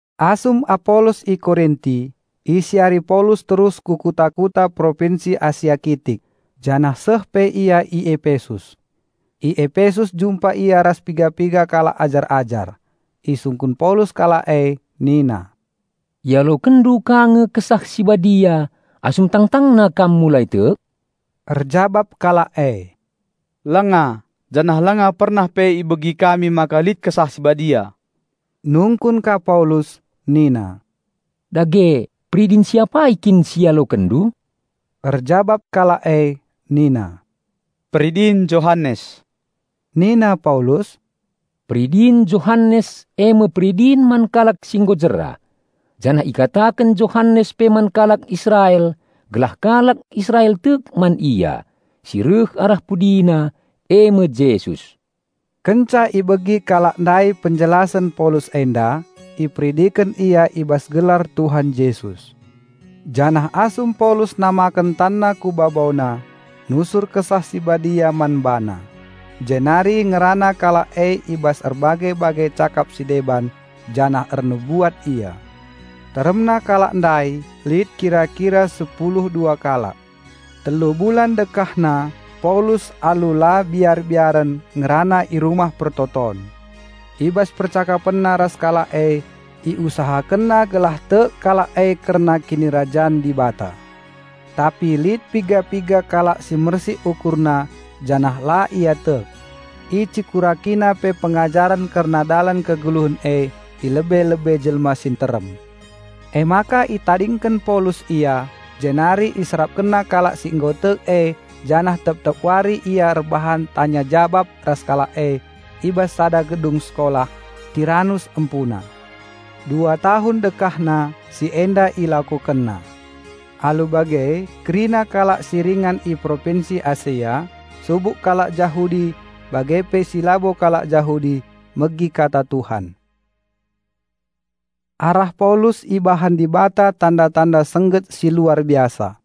Asum Apolos i Korinti, isiari Paulus terus ku kuta-kuta Propinsi Asia Kitik, janah seh pe ia i Epesus. I Epesus jumpa ia ras piga-piga kalak ajar-ajar. Isungkun Paulus kalak e nina, "Ialokenndu ka nge Kesah Si Badia asum tangtangna kam mulai tek?" Erjabap kalak e, "Langa, janah langa pernah pe ibegi kami maka lit Kesah Si Badia." Nungkun ka Paulus nina, "Dage, peridin si apai kin si ialokenndu?" Erjabap kalak e nina, "Peridin Johanes." Nina Paulus, "Peridin Johanes eme peridin man kalak si nggo jera; janah ikataken Johanes pe man kalak Israel gelah kalak Israel tek man Ia, si reh arah pudina, eme Jesus." Kenca ibegi kalak ndai penjelasen Paulus enda, iperidiken ia i bas gelar Tuhan Jesus. Janah asum Paulus namaken tanna ku babona, nusur Kesah Si Badia man bana. Jenari ngerana kalak e i bas erbage-bage cakap si deban, janah ernubuat ia. Teremna kalak ndai lit kira-kira sepulu dua kalak. Telu bulan dekahna Paulus alu la biar-biaren ngerana i rumah persembahen. I bas percakapenna ras kalak e iusahakenna gelah tek kalak e kerna Kinirajan Dibata. Tapi lit piga-piga kalak si mersik ukurna janah la ia tek. Icekurakina pe pengajaren kerna Dalan Kegeluhen e i lebe-lebe jelma si nterem. Emaka itadingken Paulus ia, jenari iserapkenna kalak si nggo tek e janah tep-tep wari ia erbahan tanya-jabap ras kalak e i bas sada gedung sekolah, Tiranus empuna. Dua tahun dekahna si enda ilakokenna. Alu bage kerina kalak si ringan i Propinsi Asia, subuk kalak Jahudi bage pe si labo kalak Jahudi megi Kata Tuhan. Arah Paulus ibahan Dibata tanda-tanda sengget si luar biasa.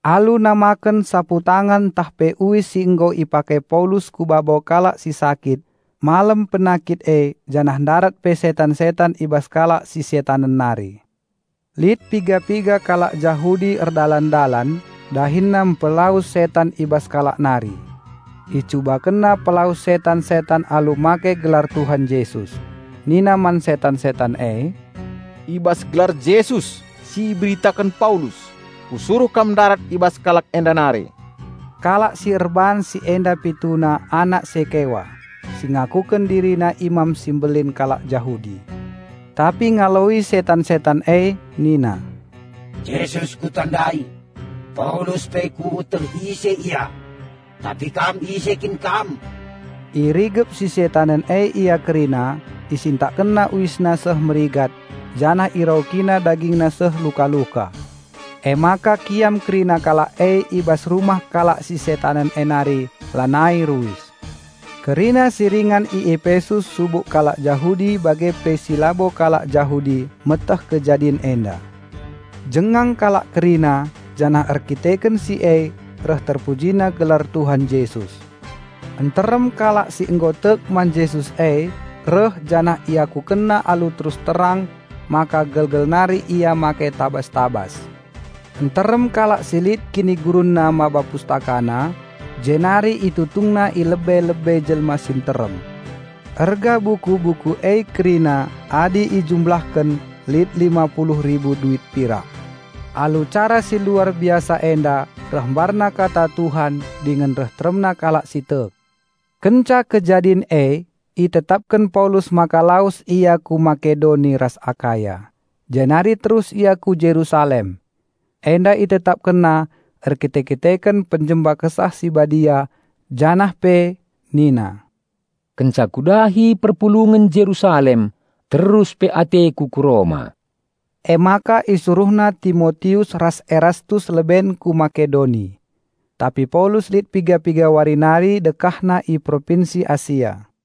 Alu namaken saputangan ntah pe uis si nggo ipake Paulus ku babo kalak si sakit malem penakit e janah ndarat pe setan-setan i bas kalak si setanen nari. Lit piga-piga kalak Jahudi erdalan-dalan, dahinna mpelawes setan i bas kalak nari. Icubakenna pelawes setan-setan alu make gelar Tuhan Jesus. Nina man setan-setan e, "I bas gelar Jesus si iberitaken Paulus, kusuruh kam ndarat i bas kalak enda nari." Kalak si erbahan si enda pituna anak Sekewa, si ngakuken dirina imam si mbelin kalak Jahudi. Tapi ngaloi setan-setan e nina, "Jesus kutandai, Paulus pe kueteh ise ia, tapi kam ise kin kam?" Irigep si setanen e ia kerina, isintakkenna uisna seh merigat janah iraukina dagingna seh luka-luka. Emaka kiam kerina kalak e i bas rumah kalak si setanen e nari lanai ruis. Kerina si ringan i Epesus subuk kalak Jahudi bage pe si labo kalak Jahudi meteh kejadin enda. Jengang kalak kerina janah erdandanken si e reh terpujina gelar Tuhan Jesus. Nterem kalak si nggo tek man Jesus e reh janah iakukenna alu terus terang maka gelgel nari ia make tabas-tabas. Nterem kalak si lit kinigurunna maba pustakana jenari itutungna i lebe-lebe jelma si nterem. Erga buku-buku e kerina adi ijumlahken lit lima puluh ribu duit pirak. Alu cara si luar biasa enda reh mbarna Kata Tuhan dingen reh teremna kalak si tek. Kenca kejadin e itetapken Paulus maka lawes ia ku Makedoni ras Akaya, jenari terus ia ku Jerusalem. Enda itetapkenna erkite-kiteken pang Kesah Si Badia. Janah pe nina, "Kenca kudahi perpulungen Jerusalem terus pe ateku ku Roma." Emaka isuruhna Timotius ras Erastus leben ku Makedoni. Tapi Paulus lit piga-piga wari nari dekahna i Propinsi Asia.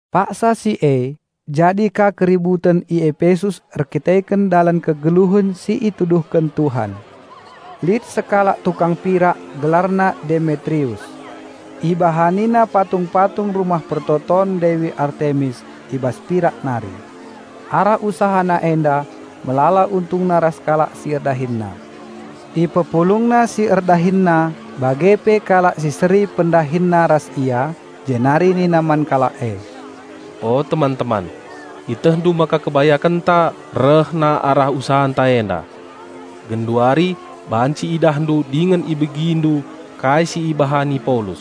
Paksa si e jadi ka keributen i Epesus erdandanken Dalan Kegeluhen si ituduhken Tuhan. Lit sekalak tukang pirak gelarna Demetrius. Ibahanina patung-patung rumah pertoton Dewi Artemis i bas pirak nari. Arah usahana enda melala untungna ras kalak si erdahinna. Ipepulungna si erdahinna bage pe kalak si seri pendahinna ras ia, jenari nina man kalak e, "O teman-teman, ietehndu maka kebayakenta rehna arah usahanta enda. Genduari banci idahndu dingen ibegindu kai si ibahani Paulus.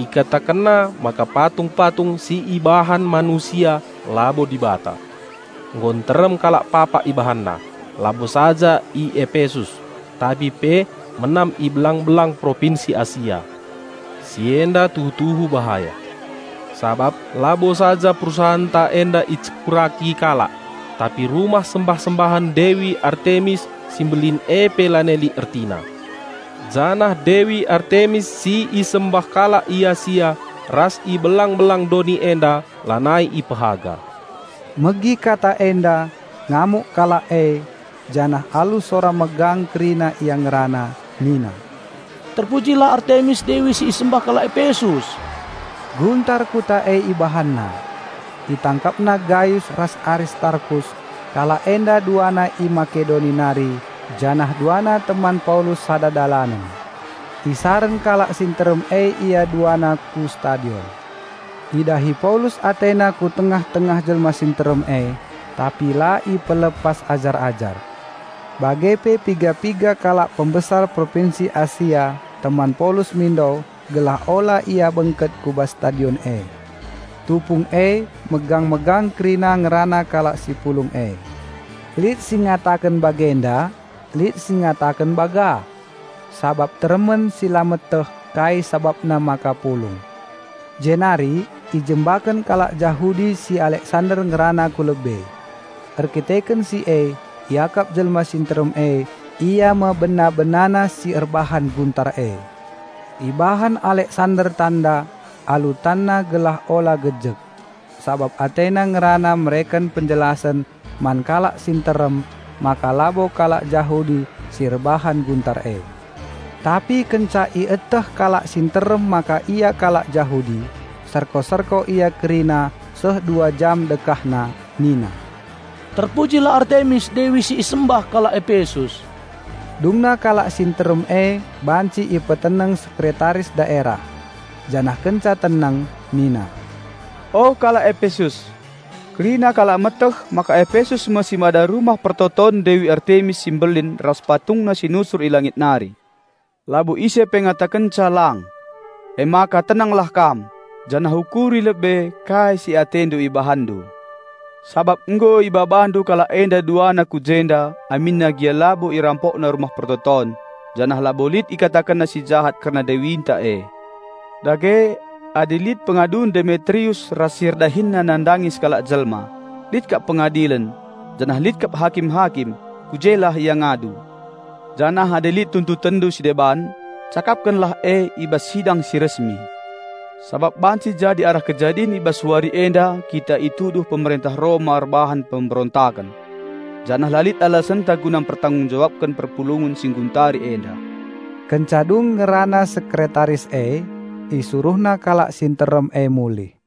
Ikatakenna maka patung-patung si ibahan manusia labo dibata. Nggo nterem kalak papak ibahanna, labo saja i Epesus tapi pe menam i belang-belang Propinsi Asia. Si enda tuhu-tuhu bahaya, sabap labo saja perusahanta enda icekuraki kalak, tapi Rumah Sembah-sembahen Dewi Artemis si mbelin e pe lanai lit ertina. Janah Dewi Artemis si isembah kalak i Asia ras i belang-belang doni enda lanai ipehaga." Megi kata enda ngamuk kalak e janah alu sora megang kerina ia ngerana nina, "Terpujilah Artemis Dewi si isembah kalak Epesus!" Guntar kuta e ibahanna. Itangkapna Gayus ras Aristarkus; kalak enda duana i Makedoni nari janah duana teman Paulus sada dalanen. Isaren kalak si nterem e ia duana ku stadion. Idahi Paulus atena ku tengah-tengah jelma si nterem e, tapi la ipelepas ajar-ajar. Bage pe piga-piga kalak pembesar Propinsi Asia teman Paulus mindo gelah ula ia bengket ku bas stadion e. Tupung e megang-megang kerina ngerana kalak si pulung e; lit si ngataken bagenda lit si ngataken bagah, sabap teremen si la meteh kai sabapna maka pulung. Jenari ijembaken kalak Jahudi si Aleksander ngerana ku lebe. Erkiteken si e iakap jelma si nterem e ia me bena-benana si erbahan guntar e. Ibahan Aleksander tanda alu tanna gelah ula gejek sabap atena ngerana mereken penjelasen man kalak si nterem maka labo kalak Jahudi si erbahan guntar e. Tapi kenca ieteh kalak si nterem maka ia kalak Jahudi, serko-serko ia kerina seh dua jam dekahna nina, "Terpujilah Artemis, Dewi si isembah kalak Epesus!" Dungna kalak si nterem e banci ipeteneng Sekretaris daerah. Janah kenca teneng nina, "O kalak Epesus! Kerina kalak meteh maka Epesus me si mada rumah pertoton Dewi Artemis si mbelin ras patungna si nusur i langit nari. Labo ise pe ngatakenca lang. Emaka tenenglah kam, janah ukuri lebe kai si atendu ibahanndu. Sabap nggo ibabandu kalak enda duana ku jenda aminna gia labo irampokna rumah pertoton janah labo lit ikatakenna si jahat kerna dewinta e. Dage adi lit pengadun Demetrius ras si erdahinna nandangi sekalak jelma, lit kap pengadilen, janah lit kap hakim-hakim, ku jelah ia ngadu. Janah adi lit tuntutenndu si deban, cakapkenlah e i bas sidang si resmi. Sabap banci jadi arah kejadin i bas wari enda kita ituduh pemerentah Roma erbahan pemberontaken. Janah la lit alasenta guna mpertanggung-jawabken perpulungen si ngguntari enda." Kenca dung ngerana sekretaris e, isuruhna kalak si nterem e mulih.